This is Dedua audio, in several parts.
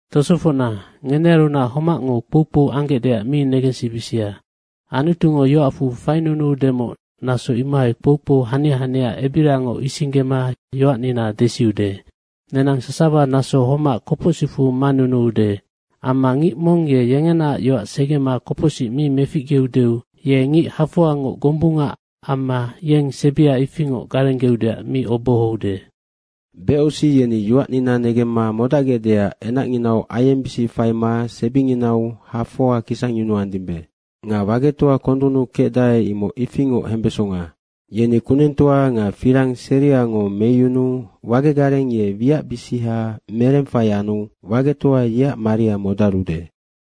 Tosofocna, ngenearunac homacngo kpoukpou anggecdeac mi negensibisia. Anutungo yoacfu fainunuudemoc naso imohai kpoukpou hanianina ebiriangoc isinggema yoacnina desiude. Nenang sasawa naso homac kopocsicfu manunuude. Amma ngic mong ye yengenaac yoac segema kopocsic mi meficgeudeu ye ngic hafoangoc gombunga amma yeng sebia ifingoc garenggeudeac mi obohoude. Anu becosi yeni yoacnina negemma modacgecdeac enacnginau aiengbisic faima sebinginau hafoa kisangyunuandimbe. Nga wagetoa kondunnu kecdae imoc ifingoc hembesonga. Yeni kunengtoa nga firang seriango meyunuu wage gareng ye wiacbisiha merengfai anu wagetoa yeac maria modarude.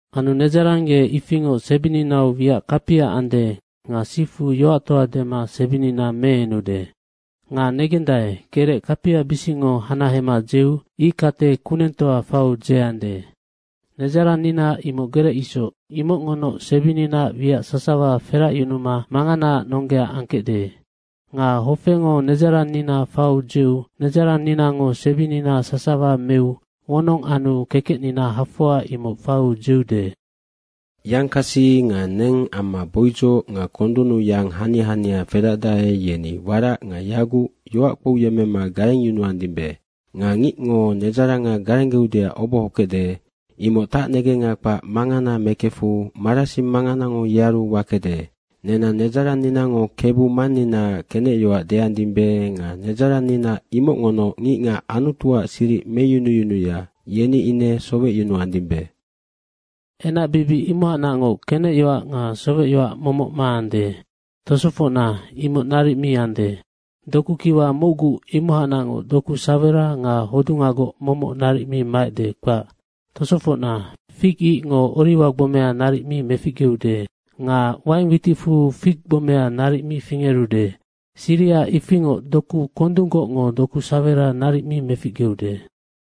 Anu nedzarang ye ifingoc sebininau wiac kapia ande nga sifu yoactoa dema sebinina meenude. Nga negenggec, gerec kapiabisicngo hanahema dzeu ickate kunengtoa faiu dzeande. Nedzarannina imoc gerec isoc, imocngonoc sebininaac wiac sasawa feracyunuma manganaac nonggea angkecde. Nga hofengo nedzarannina faiu dzeu nedzaranninango sebinina sasawa meu wonong anu kekecnina hafoa imoc faiu dzeude. Yangkasi nga neng amma boudzoc nga kondunnu yang hania hania fedacdae, yeni warac nga yaguc yoac kpouyemmema garengyunuandimbe. Nga ngicngo nedzaranga garenggeudeac obohokecde, imoc tacnegenga kpac mangana mekefu marasing manganango yearu wakede. Nenang nedzaranninango Kebu Manninaac kenecyoac deandimbe nga nedzarannina imocngonoc ngicngac Anutuac siric meyunuyunuya, yeni ine sowecyunuandimbe. Enacbibic imohacnacngoc kenecyoac nga sowecyoac momoc maande. Tosofocna, imoc naric mi ande. Doku kiwa mocgu imohacnacngoc doku sawera nga hodungagoc momoc naric mi maecde, kpac. Tosofocna, fig icngo oriwa gbomea naric mi meficgeude nga waing witicfu fig gbomea naric mi fingerude. Siriha ifingoc doku kondunggocngo doku sawera naric mi meficgeude.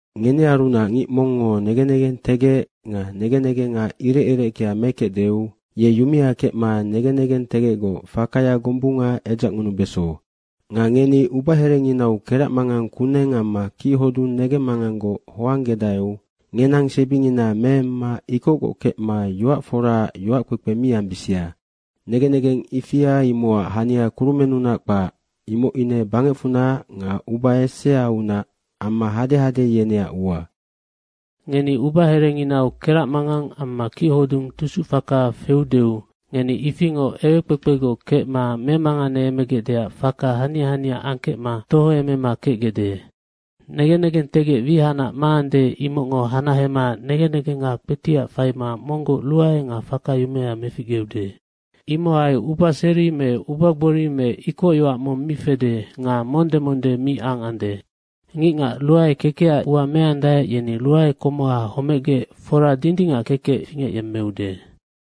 Ngenearunac ngic mongngo negen negentegec nga negen negenga irec ireckea mekecdeu, ye yumea kecma negen negentegecgoc fakaya gombunga edzacngunubeso. Nga ngeni ubaherenginau keracmangang kuneng amma kichodung negemmanganggoc hoanggedaeu ngenang sebingina meemma ikocgoc kecma yoac foraac yoackpekpe mi ambisia. Negen negeng ifia imocac hania kurumennunac kpac, imoc ine bangecfunac nga uba eseaunac amma hadehade yeneac ua. Ngeni ubaherenginau keracmangang amma kichodung tusucfaka feudeu ngeni ifingoc ewekpekpegoc kecma memanganeemegecdeac faka hania hania angkecma tohoemema kecgecde. Negen negentegec wihacnac maande, imocngo hanahema negen negenga kpetiac faima monggoc ruae nga faka yumea meficgeude. Imohai ubaseri me ubagori me ikocyoac mong mi fede nga monde monde mi angande. Ngicngac ruae kekecac ua meandae, yeni ruae komoha homecgec fora dindingac kekec fingecyemmeude.